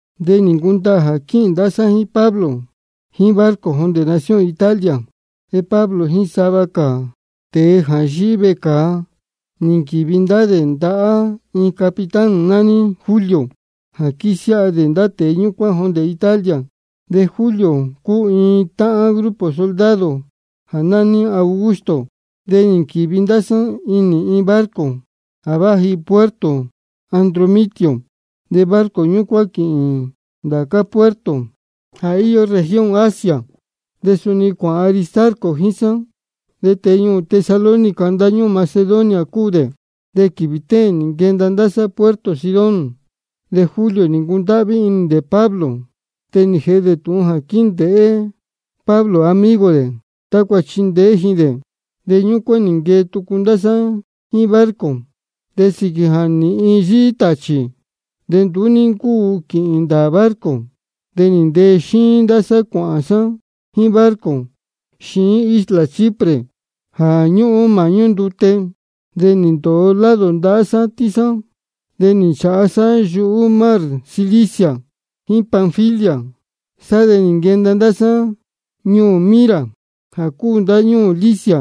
De nī ncundaā jā quíhīn ndá sá jíín Pablo jíín barco jondē nación Italia. De Pablo jíín sava cā tēe jā yíhí vecāa nī nquīvi ndá dē ndahá iin capitán nání Julio jā quísiáha dē ndá tēe ñúcuán jondē Italia, de Julio cúu iin táhán grupo soldado jā nání Augusto. De nī nquīvi ndá sá inī iin barco jā váji puerto Adramitio, de barco ñúcuán quīhīn ndācá puerto jā íyó región Asia. De suni cuāhān Aristarco jíín sá, de tēe ñuū Tesalónica ndáñúū Macedonia cúu dē. De quīvī téēn nī nquenda ndá sá puerto Sidón. De Julio nī ncundáhví inī dē Pablo, de nī jēhe dē tūhun jā quíndēhé Pablo amigo dē tácua chindeé ji dē. De ñúcuán nī nquee tucu ndá sá jíín barco. De sīquī jā nīhin yíhí tāchī de nduú ní ncúu quīhīn ndāā barco, de nī ntee xíín ndá sá cuāhān sá jíín barco xiín isla Chipre jā ñúhún māhñú ndute. De nī ndōo lado ndahá sátín sá. De nī nchāha sá yuhú mar Cilicia jíín Panfilia cuāhān sá. Sá de nī nquenda ndá sá ñuū Mira jā cúu ndáñúū Licia.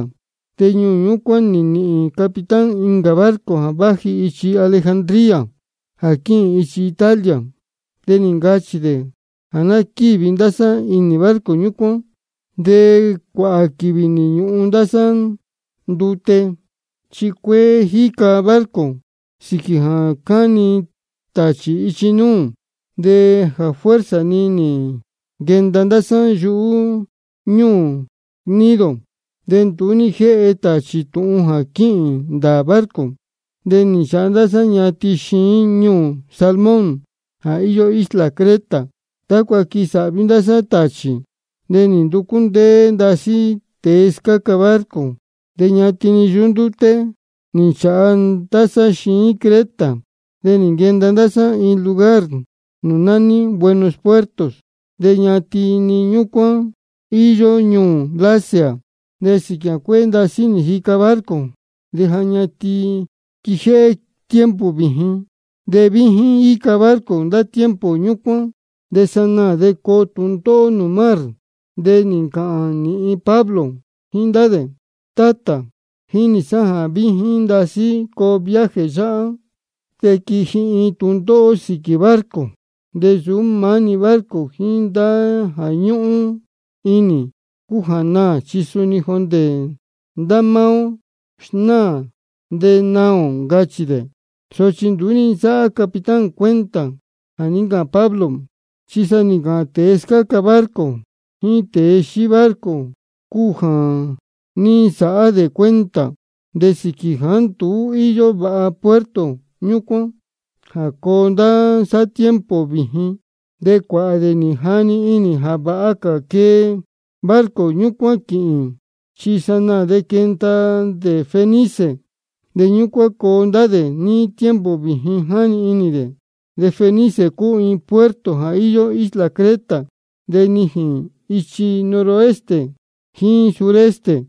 De ñuū ñúcuán nī nīhīn capitán incā barco jā váji ichi Alejandría jā quíhīn ichi Italia, de nī ncachī dē jā ná quívi ndá sá inī barco ñúcuán. De cuāhā quīvī nī ñūhun ndá sá ndute, chi cuéé nī jica barco sīquī jā cáni tāchī ichi núū. De jā fuerza-ni nī nquenda ndá sá yuhú ñúū Gnido. De nduú ní jéhe tāchī tūhun jā quíhīn ndāā barco, de nī nchāha ndá sá ñatin xiín ñuū Salmón jā íyó isla Creta, tácua quisāhvi ndá sá nūū tāchī. De nī nducú ndéé ndasí tēe scáca barco. De ñatin-ni yuhú ndúté nī nchāha ndá sá xiín Creta, de nī nquenda ndá sá iin lugar nūū nání Buenos Puertos. De ñatin-ni ñúcuán íyó ñuū Lasea. De sīquī jā cuéé ndasí nī jica barco de ja ñatin quijéhé tiempo vījin, de víjín jíca barco ndá tiempo ñúcuán de sanaā de coo tūndóhó nūū mar. De nī ncāhān nīhin Pablo jíín ndá dē: Tátā, jínī sá jā víjín ndasí coo viaje yáhá, de quiji iin tūndóhó sīquī barco. De nsūú maá-ni barco jíín jā ñúhún inī cúu jā naā, chi saá-ni jondē ndá máá ó sanaā de naā ō, ncachī dē. Sochi nduú ní nsáhá capitán cuenta jā ní ncāhān Pablo, chi sa jā ní ncāhān tēe scáca barco jíín tēe xíí barco cúu jā ní nsāhá dē cuenta. De sīquī jāá nduú íyó vāha puerto ñúcuán jā coo ndá sá níí tiempo vījin de cuāhā dē nī jani inī jā vāha cā quee barco ñúcuán quīhīn, chi sanaā de quenda dē Fenice, de ñúcuán coo ndá dē níí tiempo vījin jáni inī dē. De Fenice cúu iin puerto jā íyó isla Creta, de nijīn ichi noroeste jíín suroeste.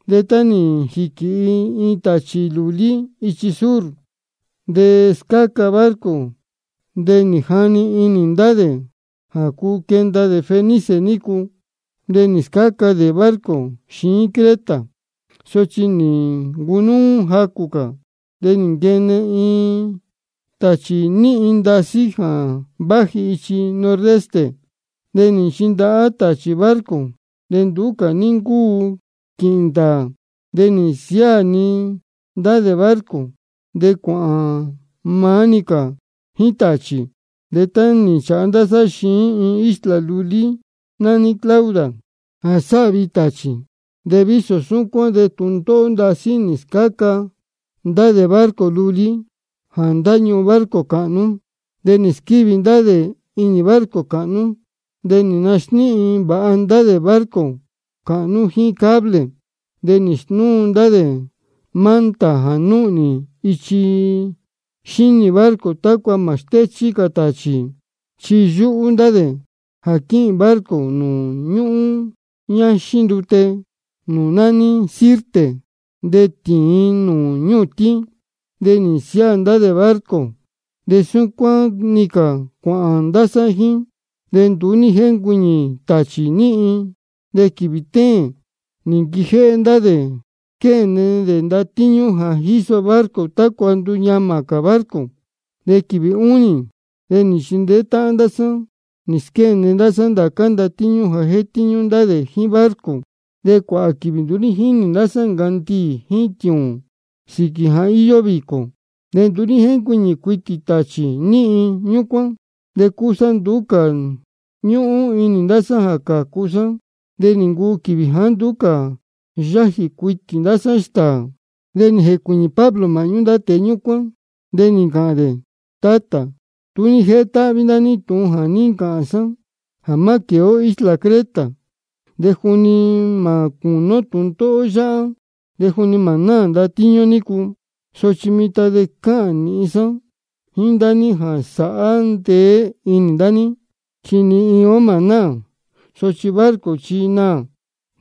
De tá nī jīquīhi iin tāchī lūlí ichi sur jā scáca barco de nī jani inī ndá dē jā cuu quenda dē Fenice nícu. De nī scáca cā dē barco xiín Creta. Sochi tá nī ncunúú jacū cā de nī nquene-ni iin tāchī níhin ndasí jā váji ichi nordeste. De nī nchindahá-ni tāchī barco, de nduú cā ní ncúu quīhīn ndāā. De nī nsiáā-ni ndá dē barco, de cuāhān maá-ni cā jíín tāchī. De nī nchāha ndá sá xiín iin isla lulí nání Clauda jā sáhvi tāchī. De vísō súcuán de tūndóhó ndasí nī scáa ndá dē barco lulí jā ndáñuhun barco cāhnú. De nī squívi ndá dē inī barco cāhnú. De nī nasníhin vāha ndá dē barco cāhnú jíín cable. De nī snúu ndá dē manta jā núhnī ichi xínī barco tácua mā stéchí cā tāchī, chi yúhú ndá dē jā quíhīn barco nūū ñúhún ñáxín ndute nūū nání Sirte de tīin nūū ñūtín. De nī nsiáā ndá dē barco de súcuán-ni cā cuāhān ndá sá jíín. De nduú ní jéncuiñī tāchī níhin. De quīvī téēn nī nquijéhé ndá dē nī squéne dē ndatíñú jā jíso barco tácua nduñamā cā barco. De quīvī únī de nī nchindeé táhán ndá sá nī squéne ndá sá ndācá ndatíñú jā jétíñú ndá dē jíín barco. De cuāhā quīvī nduú ní jínī ndá sá ncandiī jíín tiūūn sīquī jā íyó vīcō, ni nduú ní jéncuiñī cuitī tāchī níhin ñúcuán. De cúsá nduú cā ñúhún inī ndá sá jā cācu sá. De nī ncuu quīvī jāá nduú cā yájī cuitī ndá sá stāā. De nī jēcuīñī Pablo māhñú ndá tēe ñúcuán, de nī ncāhān dē: Tátā, tú ní jétáhví ndá ní tūhun jā ní ncāhān sá jā má quēe ó inī isla Creta de juni mā cūní ó tūndóhó yáhá de juni mā náā ndatíñú nícu. Sochi mitan chi cáhān nīhin sá jíín ndá ní jā sāhá ndeé inī ndá ní, chi ni iin ó mā náā, sochi barco chi naā.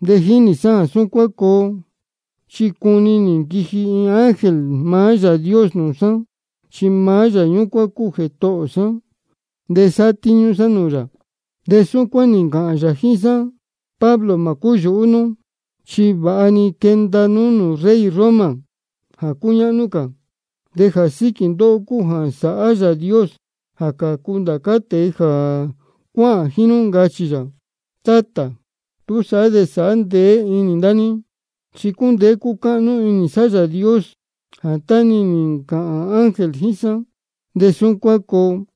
De jínī sá jā súcuán coo, chi cuni nī nquiji iin ángel maá Yāā Dios nūū sá, chi maá Yāā ñúcuán cúu Jētohō sá, de sátíñú sá nūū yā. De súcuán nī ncāhān yā jíín sá: Pablo, mā cúyūhú nú, chi vāha-ni quenda nú nūū rey Roma jā cúñáhnú cā. De jā síquī ndóhó cúu jā sāhá Yāā Dios jā cācu ndá cā tēe jā cuáhān jíín nú, ncachī yā. Tátā, túsaá de sāhá ndeé inī ndá ní, chi cúndeé cúcáhnú inī sá Yāā Dios jā tá-ni nī ncāhān ángel jíín sá de súcuán coo.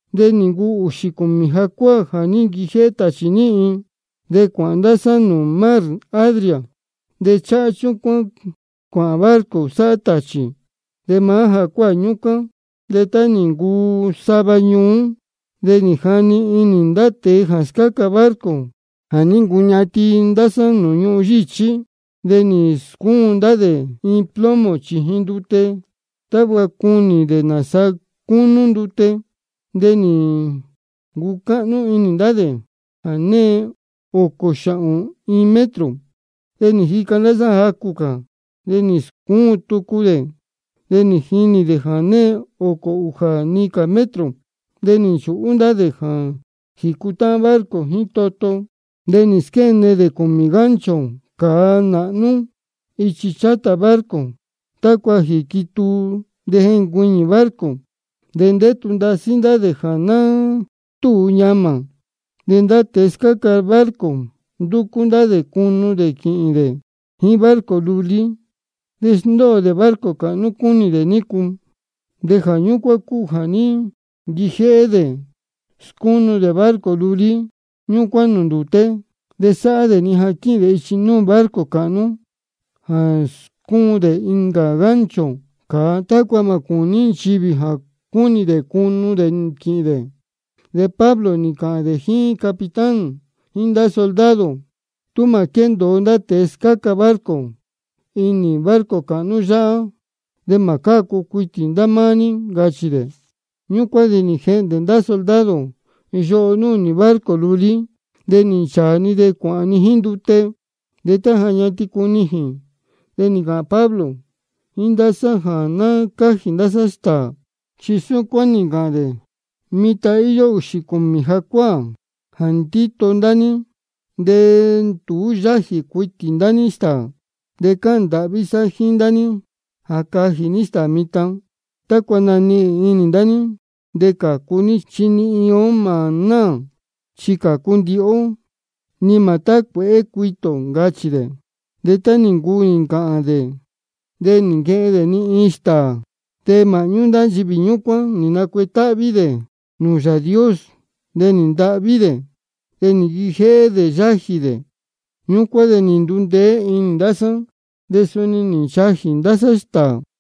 De nī ncuu ūxī cūmī jacuáā jā ní nquijéhé tāchī níhin, de cuāhān ndá sá nūū mar Adria, de cháhá chúcuán cuāhān barco sáhá tāchī. De máá jacuáā ñúcuán de tá nī ncuu sava ñuú de jáni inī ndá tēe jā scáca barco jā ní ncuñatin ndá sá ñuhun yíchí. De nī scúun ndá dē iin plomo chījin ndute tácua cunī dē nāsaa cúnú ndute, de nī ncucáhnú inī ndá dē jā née ōcō xāhōn iin metro. De nī jica ndá sá jacū cā, de nī scúun tucu dē, de nī jinī dē jā née ōcō ūjā-ni cā metro. De nī nchūhú ndá dē jā jīcutáhán barco jíín toto. De nī squéne dē cūmī gancho cāa nāhnú ichi chátā barco tácua jīquituu de jencuiñī barco. De ndétu ndasí ndá dē jā ná túu ñamā. De ndá tēe scáca barco ndúcú ndá dē cunu dē quīhīn dē jíín barco lulí, de sndóo dē barco cāhnú cúnī dē nícu. De jā ñúcuán cúu jā ní nquijéhé dē snúu dē barco lulí ñúcuán nūū ndūté, de sáhá dē-ni jā quíhīn dē ichi núū barco cāhnú jā scúun dē incā gancho cāa tácua mā cūní nchivī jā cúnī dē cunu dē quīhīn dē. De Pablo nī ncāhān dē jíín capitán jíín ndá soldado: Tú mā quéndōo ndá tēe scáca barco inī barco cāhnú yáhá de mā cácu cuitī ndá máá ní, ncachī dē. Ñúcuán de nī jehndē-ni ndá soldado yoho núhnī barco lulí, de nī nchāā-ni de cuāhān-ni jíín ndute. De tá ja ñatin cunijīn de nī ncāhān Pablo jíín ndá sá jā ná cájī ndá sá stāā. Chi súcuán nī ncāhān dē: Mitan íyó ūxī cūmī jacuáā jā ndíto ndá ní de nduú yájī cuitī ndá ní stāā. De cáhān ndāhví sá jíín ndá ní jā cajī ní stāā mitan tácua nanihīn inī ndá ní de cācu ní, chi ni iin ó mā náā, chi cācu ndihi ó, ni mā tácuēhé cuitī ō, ncachī dē. De tá nī ncuu nī ncāhān dē de nī nquehen dē-ni iin stāā. De māhñú ndá nchivī ñúcuán nī nacuetáhví dē nūū Yāā Dios, de nī ntahví dē, de nī nquijéhé dē yájī dē. Ñúcuán de nī ndundeé inī ndá sá, de suni nī nchajī ndá sá stāā.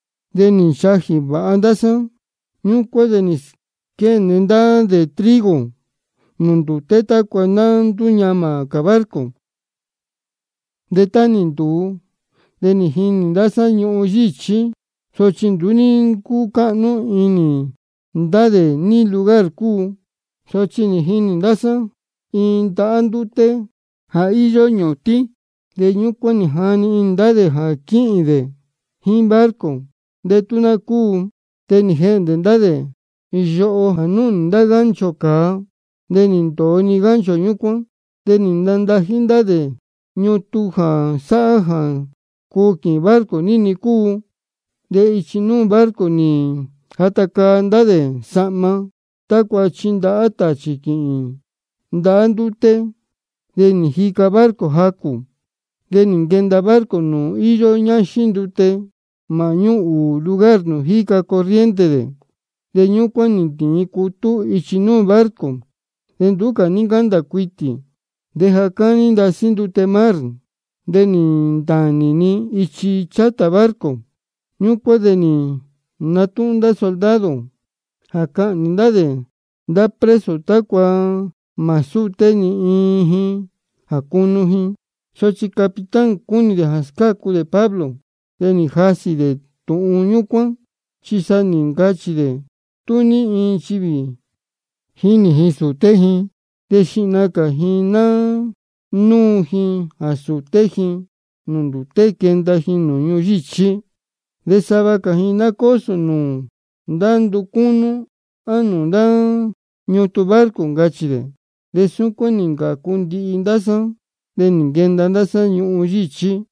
De nī nchajī vāha ndá sá. Ñúcuán de nī squéne ndá dē trigo nūū ndūté tácua ná ndúñamā cā barco. De tá nī ntūu de nī jinī ndá sá ñuhun yíchí, sochi nduú ní ncúcáhnú inī ndá dē ní lugar cúu. Sochi nī jinī ndá sá iin ndahá ndúté jā íyó ñūtín, de ñúcuán jáni inī ndá dē jā quíhīn dē jíín barco de tú ná cúu. De nī jehndē ndá dē yoho jā núhnī ndá gancho cāa, de nī ndōo-ni gancho ñúcuán. De nī nandají ndá dē ñutun jā sáhá jā cuu quīhīn barco ní-ni cúu. De ichi núū barco nī jata caa ndá dē sahma tácua chindahá tāchī quīhīn ndahá ndúté. De nī jica barco jacū. De nī nquenda barco nūū íyó ñáxín ndute māhñú ūū lugar nūū jíca corriente dē, de ñúcuán nī ntīin cutú ichi núū barco, de nduú cā ní ncándā cuitī. De jā cáni ndasí ndute mar de nī ntānī-ni ichi chátā barco. Ñúcuán de nī natúhún ndá soldado jā cahnī ndá dē ndá preso tácua mā súté ni iin ji jā cunu ji. Sochi capitán chi cúnī dē jā scácu dē Pablo, de nī jasī dē tūhun ñúcuán. Chi sa nī ncachī dē tú ní nchivī jínī ji sūté ji de xihna cā ji ná núu ji jā sūté ji nūū ndūté quenda ji ñuhun yíchí. De sava cā ji ná cósō nūū ndá nducúnú á nūū ndá ñutun barco, ncachī dē. De súcuán nī ncācu ndihi ndá sá, de nī nquenda sá ñuhun yíchí.